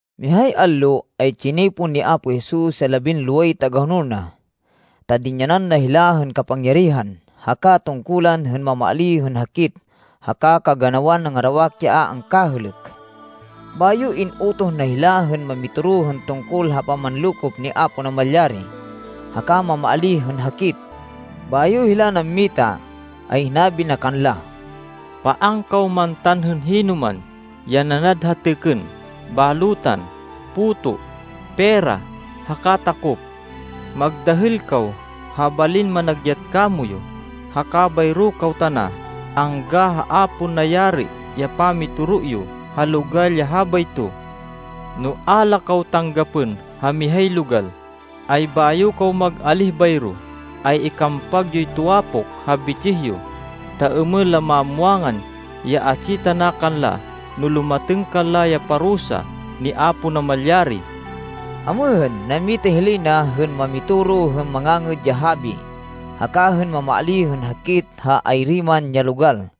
Mihay allo, ay tsinipon ni Apo Jesus ya labinloway tagahonol na, ta dinyanan na hila hên kapangyarihan haka tungkulan hên mamaalíh hên hakit haka kaganawan nangarawak ya a angkahêlêk. Bayo in-utoh na hila hên mamitoro hên tungkol ha pamanlokop ni Apo Namalyari haka mamaalíh hên hakit. Bayo hila nammita, ay hinabi na kanla, “Paan kaw mantan hên hinoman ya nanad ha têkên, balutan, puto, pera, haka takop. Magdahêl kaw ha balin managyat kamoyu, haka bayro kaw tana angga ha a pon nayari ya pamitoro yo ha logal ya habayto. No a la kaw tanggapên ha mihay logal, ay bayo kaw mag-alíh bayro, ay ikampag yoy tuwapok ha bitsih yo, ta êmên la mamwangan ya atsi tana kanla no lumatêng kanla ya parusa ni Apo Namalyari.” Amêhên, nammita hilay na hên mamitoro hên Mangangêd ya Habi haka hên mamaalíh hên hakit ha ayri man ya logal.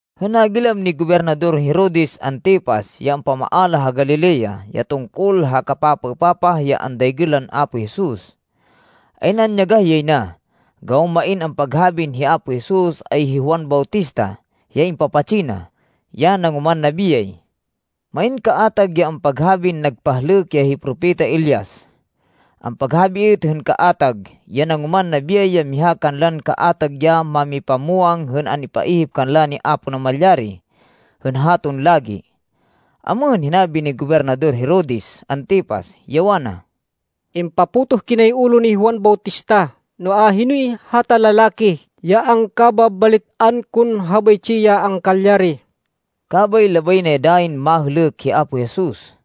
Hên nagilam ni Gobernador Herodes Antipas ya ampamaala ha Galilea ya tungkol ha kapapaêpapah ya andaygên lan Apo Jesus, ay nanyagah yay na, gawan main ampaghabin hi Apo Jesus ay Juan Bautista ya impapatsi na, ya nangoman nabiyay. Main kaatag ya ampaghabin nagpahlêk ya hi propeta Elias. Ampaghabi êt hên kaatag, ya nangoman nabiyay ya miha kanlan kaatag ya mámipamwang hên an-ipaihip kanla ni Apo Namalyari hên haton lagi. Amêhên, hinabi ni Gobernador Herodes Antipas, ya wana, “Impapotoh kinay ulo ni Juan Bautista, noa, hinoy hata lalaki ya angkababalit-an kon habaytsi ya angkalyari?” Kabay labay na ya dayin mahêlêk hi Apo Jesus.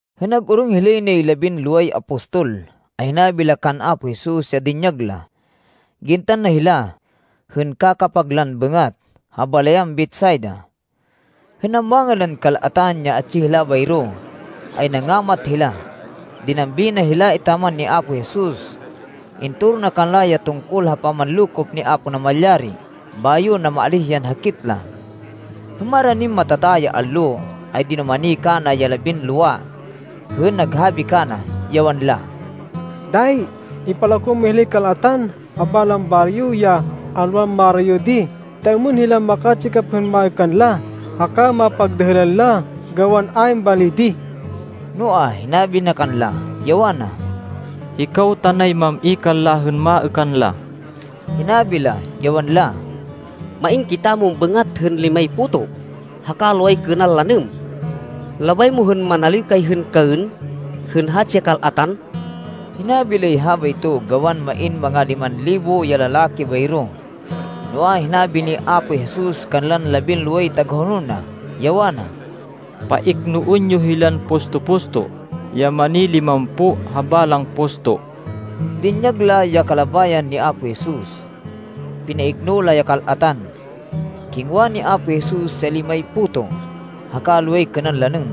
Hên nag-orong hilay nay labinloway apostol, ay hinabi la kan Apo Jesus ya dinyag la. Gintan na hila, hên kakapag lan bêngat, ha balayan Betsaida. Hên namwangan lan kal-atan, ya atsi hila bayro, ay nangamat hila. Dinambi na hila etaman ni Apo Jesus. Intoro na kanla ya tungkol ha pamanlokop ni Apo Namalyari bayo namaalíh yan hakit la. Hên maranin matata ya allo ay dinumani kana ya labinlowa hên naghabi kana, ya wanla, “Dayi ipalako mo hilay kal-atan ha balang baryo, ya alwan marayo di ta êmên hila makatsikap hên maêkan la haka mapagdahêlan la gawan ayn bali di.” Noa, hinabi na kanla, ya wana, “Hikaw tanay mam-i kanla hên maêkan la.” Hinabi la, ya wanla, “Main kitamon bêngat hên limay puto haka loway kênan lanêm. Labay mo hên manaliw kay hên kaên hên hatsi ya kal-atan?” Hinabi lay habayto, gawan main manga liman libo ya lalaki bayro. Noa, hinabi ni Apo Jesus kanlan labinloway tagahonol na, ya wana, “Paiknoên yo hilan pusto-pusto ya mani-limampo ha balang pusto.” Dinyag la ya kalabayan ni Apo Jesus. Pinaikno la ya kal-atan. Kingwa ni Apo Jesus ya limay puto haka loway kênan lanêm.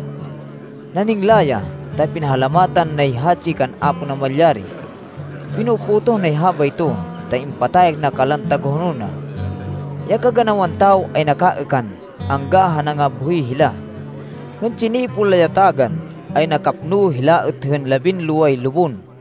Naningla ya, ta pinahalamatan nay hatsi kan Apo Namalyari. Pino-potoh nay habayto, ta impatayak na kanlan tagahonol na. Ya kaganawan tawo ay nakaêkan angga ha nangabhoy hila. Hên tsinipon la ya tagan, ay nakapno hila êt hên labinloway lubon.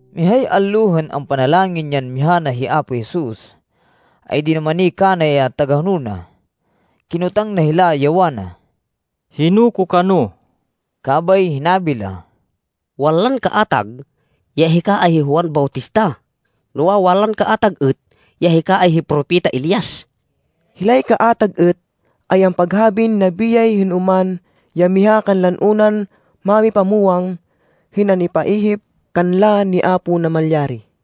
Mihay allo hên ampanalangin yan miha na hi Apo Jesus, ay dinumani kana ya tagahonol na. Kinotang na hila, ya wana, “Hino ko kano?” Kabay hinabi la, “Wanlan kaatag ya hika ay hi Juan Bautista. Noa, wanlan kaatag êt ya hika ay hi Propeta Elias. Hilay kaatag êt ay ampaghabin nabiyay hên oman ya miha kanlan unan mámipamwang hên an-ipaihip kanla ni Apo Namalyari.”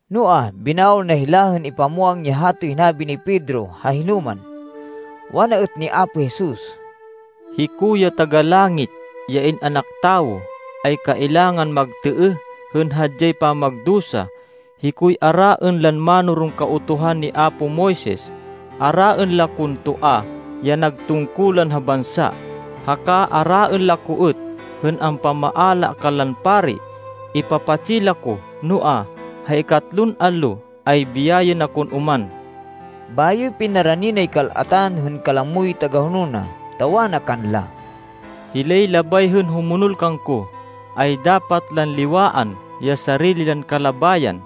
Noa, binawal na hila hên ipamwang ya hatoy hinabi ni Pedro ha hinoman. Wana êt ni Apo Jesus, “Hiko ya Taga-Langit, ya In-anak Tawo, ay kailangan magtêêh hên hadyay pamagdusa. Hikoy araên lan mánoron Kautuhan ni apo Moises. Araên la kon toa ya nag tungkulan ha bansa, haka araên la ko êt hên ampamaala kanlan pari. Ipapatsi la ko, noa, ha ikatlon allo ay biyayên akon oman.” Bayo pinarani nay kal-atan hên kalamoy tagahonol na, ta wana kanla, “Hilay labay hên humonol kangko, ay dapat lan liwaan ya sarili lan kalabayan.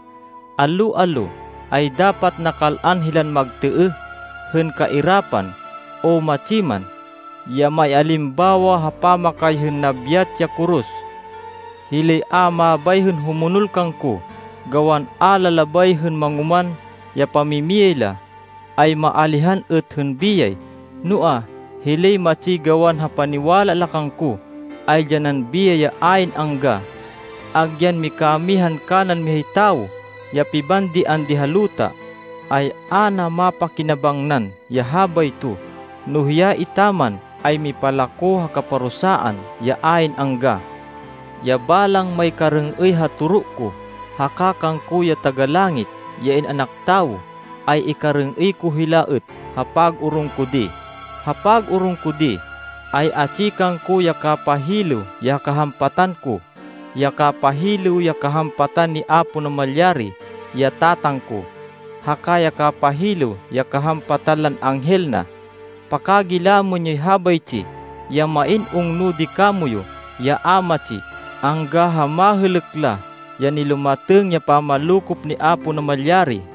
Allo-allo ay dapat nakal-an hilan magtêêh hên kairapan, o matsi man, ya maialimbawa ha pamakay hên nabyat ya koros. Hilay a mabay hên humonol kangko, gawan a la labay hên mangoman ya pamimiyay la, ay maalihan êt hên biyay. Noa, hilay matsi gawan ha paniwala la kangko, ay dyanan biyay ya ayn angga. Agyan mikamihan kanan mihay tawo ya pibandian di ha luta, ay a na mapakinabangnan ya habayto, no hiya etaman ay mipalako ha kaparusaan ya ayn angga! Ya balang maykarêng-êy ha toro ko, haka kangko, ya Taga-Langit, ya In-anak Tawo, ay ikarêng-êy ko hila êt ha pag-orong ko di. Ha pag-orong ko di, ay atsi kangko ya kapahilêw ya kahampatan ko, ya kapahilêw ya kahampatan ni Apo Namalyari, ya Tatang ko, haka ya kapahilêw ya kahampatan lan anghel na. Pakagilamên yoy habaytsi, ya main ungno di kamoyu ya a matsi angga ha mahêlêk la, ya nilumatêng ya pamanlokop ni Apo Namalyari.”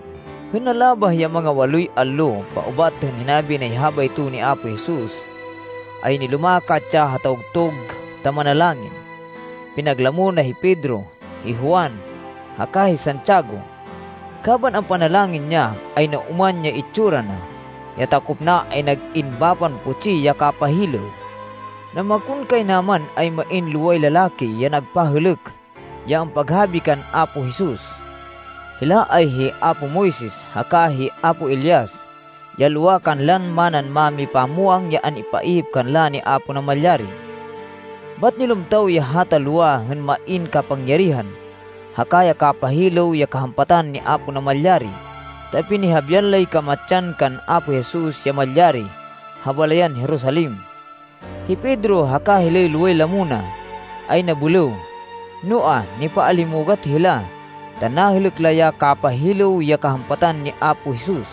Hên nalabah ya manga waloy allo paubat hên hinabi nay habayto ni Apo Jesus, ay nilumakat ya ha tawgtug ta manalangin. Pinaglamo na hi Pedro, hi Juan haka hi Santiago. Kaban ampanalangin ya, ay naoman ya itsura na. Ya takop na ay nag-in bapan putsi ya kapahilêw. Namakonkaynaman ay main loway lalaki ya nagpahêlêk ya ampaghabi kan Apo Jesus. Hila ay hi apo Moises haka hi apo Elias ya lowa kanlan manan mámipamwang ya an-ipaihip kanla ni Apo Namalyari. Bat nilumtaw ya hata lowa hên main kapangyarihan haka ya kapahilêw ya kahampatan ni Apo Namalyari, ta pinihabian lay kamatsan kan Apo Jesus ya malyari ha balayan Jerusalem. Hi Pedro haka hilay loway lamo na ay nabêlêw, noa, nipaalimugat hila ta nahêlêk la ya kapahilêw ya kahampatan ni Apo Jesus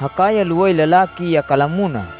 haka ya loway lalaki ya kalamo na.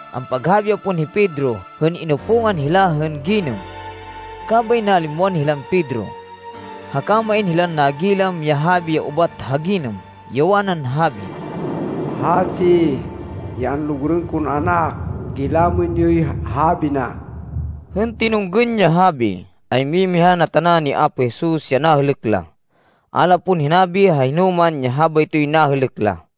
Ampaghabi ya pon hi Pedro hên inupungan hila hên ginêm. Kabay nalimwan hilan Pedro. Haka main hilan nagilam ya habi ya ubat ha ginêm, ya wanan habi, “Hatsi ya anlugurên kon Anak. Gilamên yoy habi na!” Hên tinunggên ya habi, ay mimiha na tana ni Apo Jesus ya nahêlêk la. A la pon hinabi ha hinoman ya habaytoy nahêlêk la.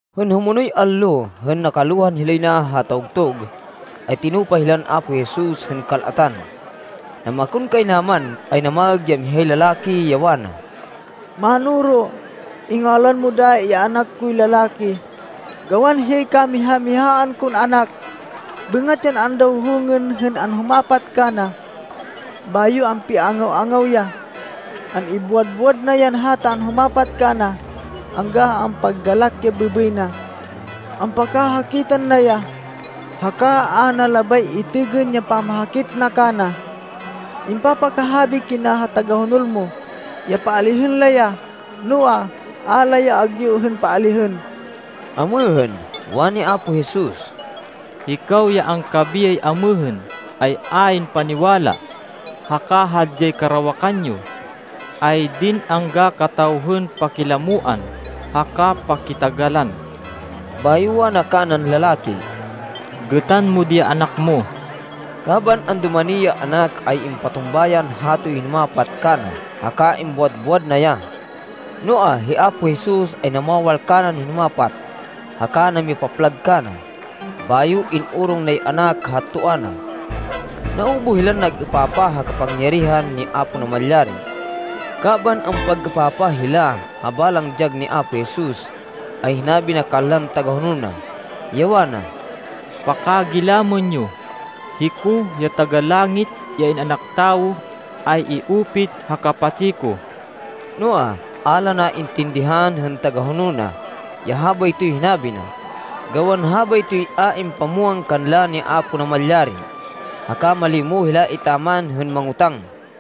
Hên humonoy allo, hên nakalohan hilay na ha tawgtug, ay tinupa hilan Apo Jesus hên kal-atan. Namakonkaynaman ay namaêg ya mihay lalaki, ya wana, “Mánoro, ingalwan mo dayi ya anak koy lalaki gawan hiyay kamiha-mihaan kon anak. Bêngat yan andawhongên hên anhumapat kana, bayo ampiangaw-angaw ya. An-ibuwad-buwad na yan hata anhumapat kana angga ha ampaggalak ya bêbêy na. Ampakahakitan na ya haka a na labay itêgên ya pamahakit na kana. Impapakahabi kina ha tagahonol mo ya paalihên la ya, noa, a la ya agyu hên paalihên.” Amêhên, wani Apo Jesus, “Hikaw ya angkabiyay amêhên ay ayn paniwala haka hadyay karawakan yo. Aydin angga kataw hên pakilamoan haka pakitagalan?” Bayo wana kanan lalaki, “Gêtan mo di ya anak mo.” Kaban andumani ya anak ay impatumba yan hatoy hinumapat kana haka imbuwad-buwad na ya. Noa, hi Apo Jesus ay namawal kanan hinumapat haka namipaplag kana, bayo in-orong nay anak ha toa na. Naubuh hilan nag-êpapah ha kapangyarihan ni Apo Namalyari. Kaban ampag-êpapah hila ha balang dyag ni Apo Jesus, ay hinabi na kanlan tagahonol na, ya wana, “Pakagilamên yo. Hiko, ya Taga-Langit, ya In-anak Tawo, ay i-upit ha kapatsi ko.” Noa, a la naintindihan hên tagahonol na ya habaytoy hinabi na, gawan habaytoy a impamwang kanla ni Apo Namalyari. Haka malimo hila etaman hên mangotáng.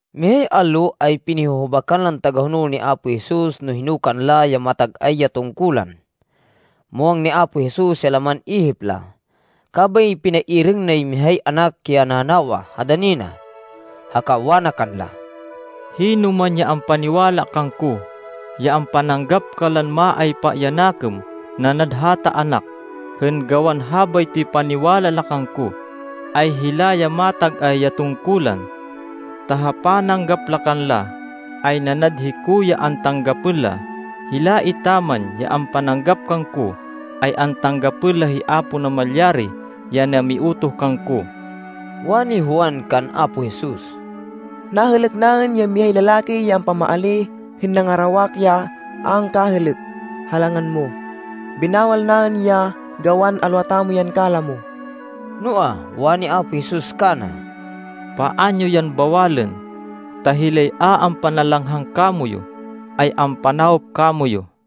Mihay allo ay pinihuhubakan lan tagahonol ni Apo Jesus no hino kanla ya matag-ay ya tungkulan. Muwang ni Apo Jesus ya laman ihip la, kabay pinairêng nay mihay anak ya nanawa ha dani na. Haka wana kanla, “Hinoman ya ampaniwala kangko, ya ampananggap kanlan maaypa ya nakêm nanad hata anak, hên gawan habaytoy paniwala la kangko, ay hila ya matag-ay ya tungkulan. Ta ha pananggap la kanla, ay nanad hiko ya antanggapên la. Hila etaman ya ampananggap kangko, ay antanggapên la hi Apo Namalyari ya namiutoh kangko.” Wani Juan kan Apo Jesus, “Nahêlêk naên ya mihay lalaki ya ampamaalíh hên nangarawak ya a angkahêlêk ha langan mo. Binawal naên ya gawan alwa tamo yan kalamo.” Noa, wani Apo Jesus kana, “Paan yo yan bawalên, ta hilay a ampanalanghang kamoyu ay ampanawop kamoyu.”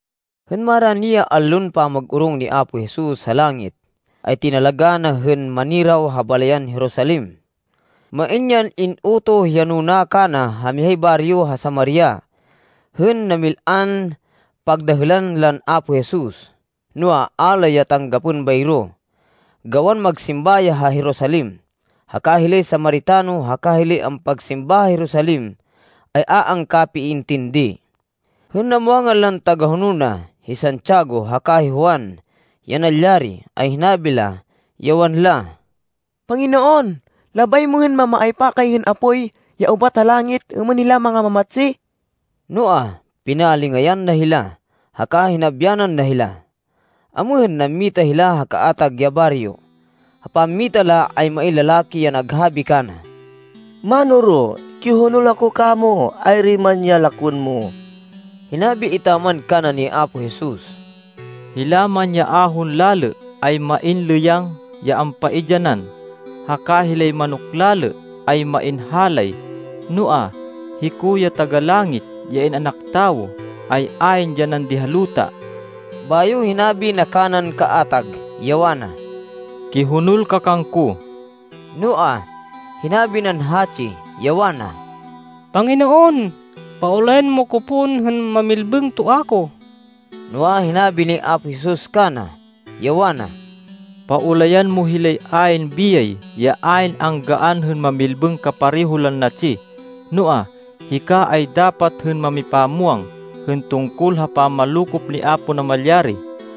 Hên marani ya allon pamag-orong ni Apo Jesus ha langit, ay tinalagá na hên maniraw ha balayan Jerusalem. Main yan in-utoh ya nuna kana ha mihay baryo ha Samaria hên namil-an pagdahêlan lan Apo Jesus. Noa, a la ya tanggapên bayro gawan magsimba ya ha Jerusalem, haka hilay Samaritano haka hilay ampagsimba ha Jerusalem ay a angkapiintindi. Hên namwangan lan tagahonol na, hi Santiago haka hi Juan, ya nalyari, ay hinabi la, ya wanla, “Panginoon, labay mo hên mamaaypa kay hên apoy ya ubat ha langit êmên hila mangamamatsi?” Noa, pinalingayan na hila, haka hinabyanan na hila. Amêhên, nammita hila ha kaatag ya baryo. Ha pammita la, ay main lalaki ya naghabi kana, “Mánoro, kihonol ako kamo ayri man ya lakwên mo.” Hinabi etaman kana ni Apo Jesus, “Hila man ya ahon lalê ay main lêyang ya ampaidyanan, haka hilay manok lalê ay main halay, noa, hiko ya Taga-Langit, ya In-anak Tawo, ay ayn dyanan di ha luta.” Bayo, hinabi na kanan kaatag, ya wana, “Kihonol ka kangko.” Noa, hinabi nan hatsi, ya wana, “Panginoon, paulayan mo ko pon hên mamilbêng toa ko.” Noa, hinabi ni Apo Jesus kana, ya wana, “Paulayan mo hilay ayn biyay ya ayn anggaan hên mamilbêng kapareho lan natsi. Noa, hika ay dapat hên mamipamwang hên tungkol ha pamanlokop ni Apo Namalyari.”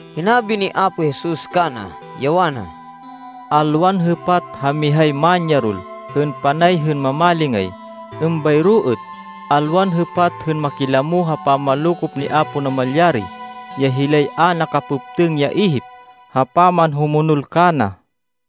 Hinabi ni Apo Jesus kana, ya wana, “Alwan hêpat ha mihay manyarol hên panay hên mamalingay. Êmbayro êt, alwan hêpat hên makilamo ha pamanlokop ni Apo Namalyari ya hilay a nakapêptêng ya ihip ha pamanhumonol kana.”